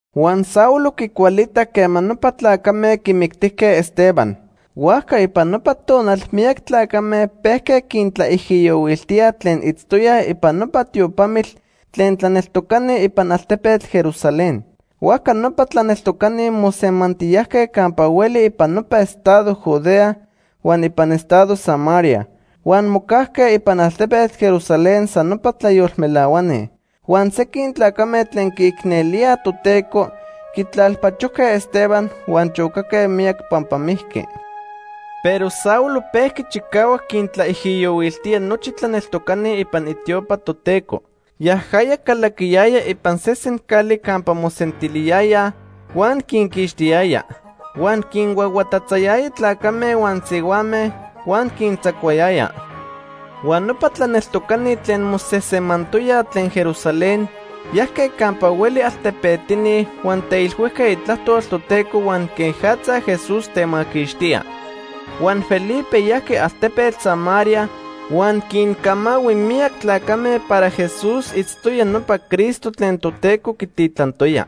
Huan Saulo quicualitac quema nopa tlacame quimictijque Esteban. Huajca ipan nopa tonal miyac tlacame pejque quintlaijiyohuiltíaj tlen itztoyaj ipan nopa tiopamitl tlen tlaneltocani ipan altepetl Jerusalén. Huajca nopa tlaneltocani mosemantiyajque campa hueli ipan nopa estado Judea huan ipan estado Samaria. Huan mocajque ipan altepetl Jerusalén san nopa tlayolmelahuani. Huan sequin tlacame tlen quiicnelíaj Toteco quitlalpachojque Esteban huan chocaque miyac pampa mijqui. Pero Saulo pejqui chicahuac quintlaijiyohuiltía nochi tlaneltocani ipan itiopa Toteco. Yajaya calaquiyaya ipan sesen cali campa mosentiliyayaj huan quinquixtiyaya. Huan quinhuahuatatzayaya tlacame huan sihuame huan quintzacuayaya. Huan nopa tlaneltocani tlen mosejsemantoyaj tlen Jerusalén, yajque campa hueli altepetini huan teilhuijque itlajtol Toteco huan quejatza Jesús temaquixtía. Huan Felipe yajqui altepetl Samaria huan quincamahui miyac tlacame para Jesús itztoya nopa Cristo tlen Toteco quititlantoya.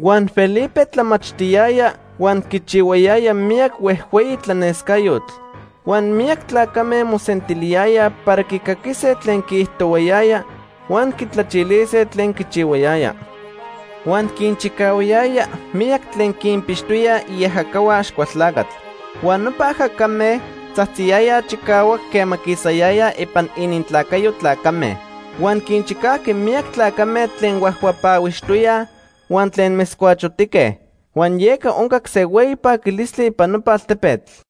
Huan Felipe tlamachtiyaya huan quichihuayaya miyac huejhueyi tlanescayotl. Huan miyac tlacame mosentiliyayaj para quicaquise tlen quiijtohuayaya huan quitlachilise tlen quichihuayaya. Huan quinchicahuayaya miyac tlen quinpixtoyaj iajacahua Axcualtlacatl. Huan nopa ajacame tzajtziyayaj chicahuac quema quisayayaj ipan inintlacayo tlacame. Huan quinchicajqui miyac tlacame tlen huajhuapahuixtoyaj huan tlen metzcuachotique. Huan yeca oncac se hueyi paquilistli ipan nopa altepetl.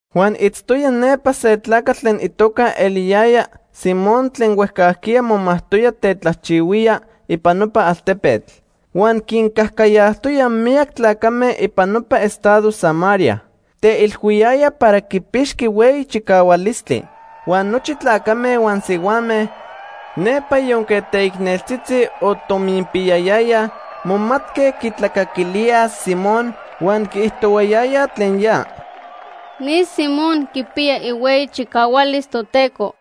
Huan itztoya nepa se tlacatl tlen itoca eliyaya Simón tlen huejcajquiya momajtoya tetlajchihuía ipan nopa altepetl. Huan quincajcayajtoya miyac tlacame ipan nopa estado Samaria. Teilhuiyaya para quipixqui hueyi chicahualistli. Huan nochi tlacame huan sihuame nepa yonque teicneltzitzi o tominpiyayayaj momatque quitlacaquilíaj Simón huan quiijtohuayayaj tlen ya: “Ni Simón quipiya ihueyi chicahualis Toteco.”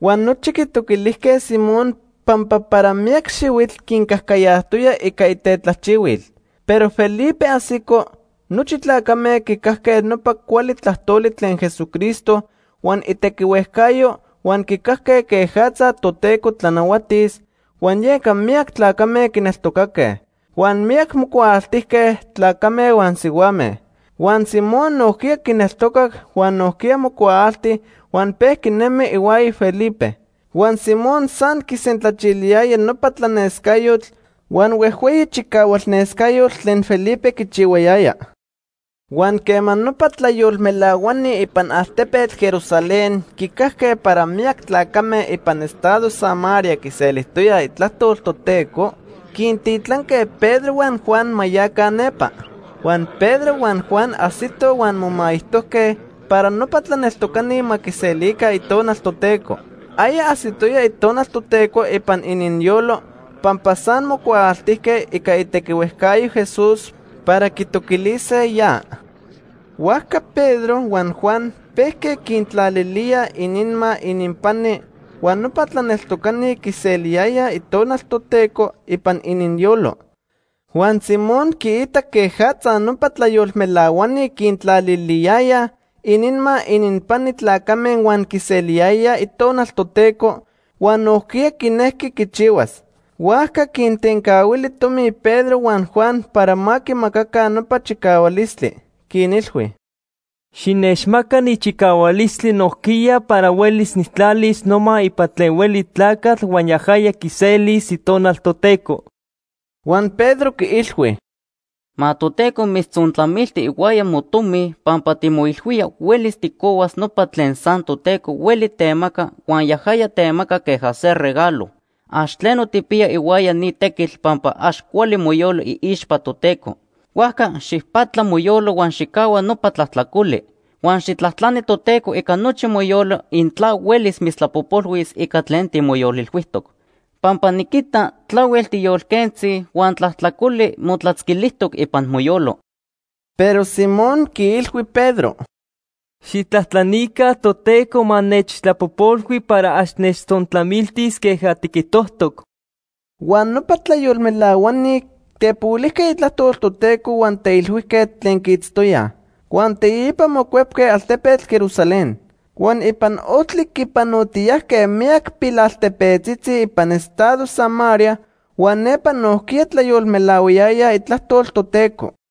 Huan nochi quitoquilijque Simón pampa para miyac xihuitl quincajcayajtoya ica itetlajchihuil. Pero Felipe ajsico, nochi tlacame quicajque nopa cuali tlajtoli tlen Jesucristo huan itequihuejcayo huan quicajque quejatza Toteco tlanahuatis, huan yeca miyac tlacame quineltocaque. Huan miyac mocuaaltijque, tlacame huan sihuame. Huan Simón nojquiya quineltocac huan nojquiya mocuaalti huan pejqui nemi ihuaya Felipe. Huan Simón san quisentlachiliyaya nopa tlanescayotl huan huejhueyi chicahualnescayotl tlen Felipe quichihuayaya. Huan quema nopa tlayolmelahuani ipan altepetl Jerusalén quicajque para miyac tlacame ipan estado Samaria quiselijtoyaj itlajtol Toteco, quintitlanque Pedro huan Juan ma yaca nepa. Huan Pedro huan Juan ajsitoj huan momaijtojque para nopa tlaneltocani ma quiselica Itonal Toteco. Aya ajsitoya Itonal Toteco ipan ininyolo, pampa san mocuaaltijque ica itequihuejcayo Jesús para quitoquilise ya. Huajca Pedro huan Juan pejque quintlalilíaj ininma ininpani huan nopa tlaneltocani quiseliyayaj Itonal Toteco ipan ininyolo. Huan Simón quiitac quejatza nopa tlayolmelahuani quintlaliliyayaj ininma ininpani tlacame huan quiseliyayaj Itonal Toteco, huan nojquiya quinejqui quichihuas. Huajca quintencahuili tomi Pedro huan Juan para ma quimacaca nopa chicahualistli. Quinilhui: ―Xinechmacaca ni chicahualistli nojquiya para huelis nijtlalis noma ipan tlen hueli tlacatl huan yajaya quiselis Itonal Toteco. Huan Pedro quiilhui: ―Ma Toteco mitztzontlamilti ihuaya motomi pampa timoilhuía huelis tijcohuas nopa tlen san Toteco hueli temaca huan yajaya temaca queja se regalo. Ax tleno tijpiya ihuaya ni tequitl pampa ax cuali moyolo iixpa Toteco. Huajca xijpatla moyolo huan xijcahua nopa tlajtlacoli. Huan xijtlajtlani Toteco ica nochi moyolo intla huelis mitztlapojpolhuis ica tlen timoyolilhuijtoc, pampa niquita tlahuel tiyolquentzi huan tlajtlacoli motlatzquilijtoc ipan moyolo. Pero Simón quiilhui Pedro: ―Xijtlajtlanica Toteco ma nechtlapojpolhui para ax nechtzontlamiltis queja tiquijtojtoc. Huan nopa tlayolmelahuani tepohuilijque itlajtol Toteco huan teilhuijque tlen quiitztoyaj. Huan teipa mocuepque altepetl Jerusalén. Huan ipan ojtli quipanotiyajque miyac pilaltepetzitzi ipan estado Samaria huan nepa nojquiya tlayolmelahuayayaj itlajtol Toteco.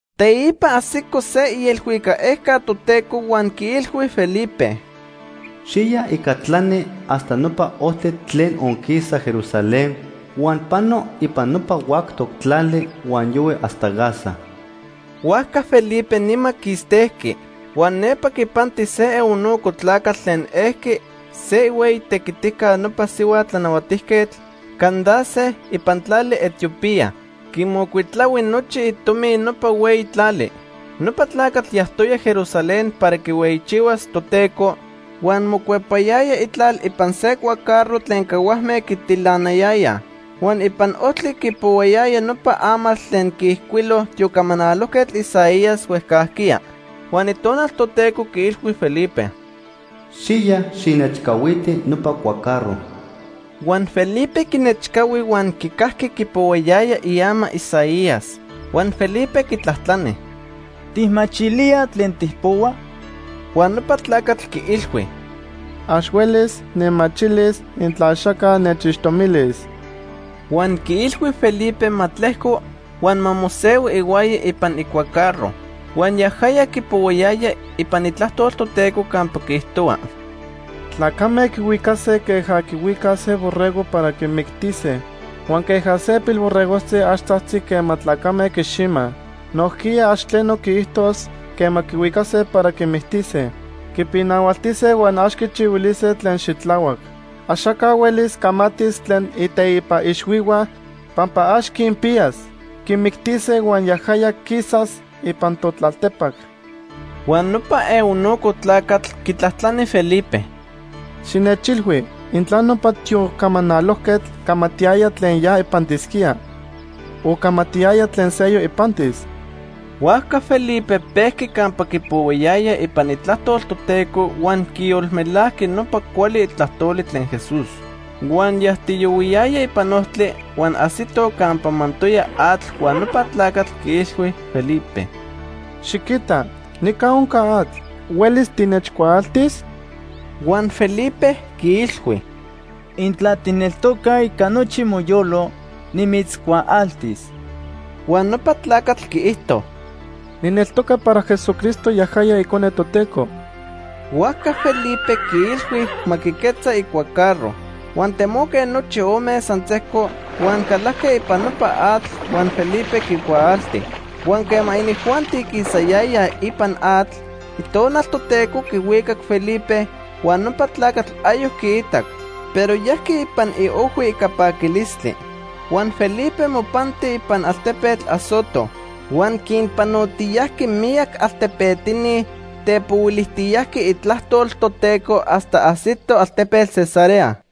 Teipa ajsico se ielhuicac ejca Toteco huan quiilhui Felipe: “Xiya ica tlani hasta nopa ojtli tlen onquisa Jerusalén huan pano ipan nopa huactoc tlali huan yohui hasta Gaza.” Huajca Felipe nima quistejqui. Huan nepa quipanti se eunuco tlacatl tlen elqui se ihueyi tequitica nopa sihua tlanahuatijquetl, Candace, ipan tlali Etiopía. Quimocuitlahui nochi itomi nopa hueyi tlali. Nopa tlacatl yajtoya Jerusalén para quihueyichihuas Toteco, huan mocuepayaya itlal ipan se cuacarro tlen cahuajme quitilanayayaj. Huan ipan ojtli quipohuayaya nopa amatl tlen quiijcuilo tiocamanalojquetl Isaías huejcajquiya. Huan Itonal Toteco quiilhui Felipe: ―Xiya, xijnechcahuiti nopa cuacarro. Huan Felipe quinechcahui huan quicajqui quipohuayaya iama Isaías. Huan Felipe quitlajtlani: ―¿Tijmachilía tlen tijpohua? Huan nopa tlacatl quiilhui: ―Ax huelis nijmachilis intla axaca nechixtomilis. Huan quiilhui Felipe ma tlejco huan ma mosehui ihuaya ipan icuacarro. Huan yajaya quipohuayaya ipan Itlajtol Toteco campa quiijtohua: “Tlacame quihuicase queja quihuicaj se borrego para quimictise. Huan queja se pilborregojtzi ax tzajtzi quema tlacame quiximaj, nojquiya ax tleno quiijtos quema quihuicase para quimictise. Quipinahualtise huan ax quichihuilise tlen xitlahuac. Axaca huelis camatis tlen iteipa ixhuihua, pampa ax quinpiyas. Quimictise huan yajaya quisas ipan totlaltepac.” Huan nopa eunuco tlacatl quitlajtlani Felipe: ―Xinechilhui intla nopa tiocamanalojquetl camatiyaya tlen ya ipantisquía, o camatiyaya tlen seyoc ipantis. Huajca Felipe pejqui campa quipohuayaya ipan Itlajtol Toteco huan quiyolmelajqui nopa cuali tlajtoli tlen Jesús. Huan yajtiyohuiyayaj ipan ojtli, huan ajsitoj campa mantoya atl huan nopa tlacatl quiilhui Felipe: ―Xiquita, nica onca atl. ¿Huelis tinechcuaaltis? Huan Felipe quiilhui: ―Intla tijneltoca ica nochi moyolo, nimitzcuaaltis. Huan nopa tlacatl quiijto: ―Nijneltoca para Jesucristo yajaya Icone Toteco. Huajca Felipe quiilhui ma quiquetza icuacarro. Huan temoque nochi ome san sejco huan calajque ipan nopa atl huan Felipe quicuaalti. Huan quema inijuanti quisayayaj ipan atl, Itonal Toteco quihuicac Felipe, huan nopa tlacatl ayoc quiitac, pero yajqui ipan iojhui ica paquilistli. Huan Felipe mopanti ipan altepetl Azoto. Huan quinpanotiyajqui miyac altepetini tepohuilijtiyajqui itlajtol Toteco hasta ajsito altepetl Cesarea.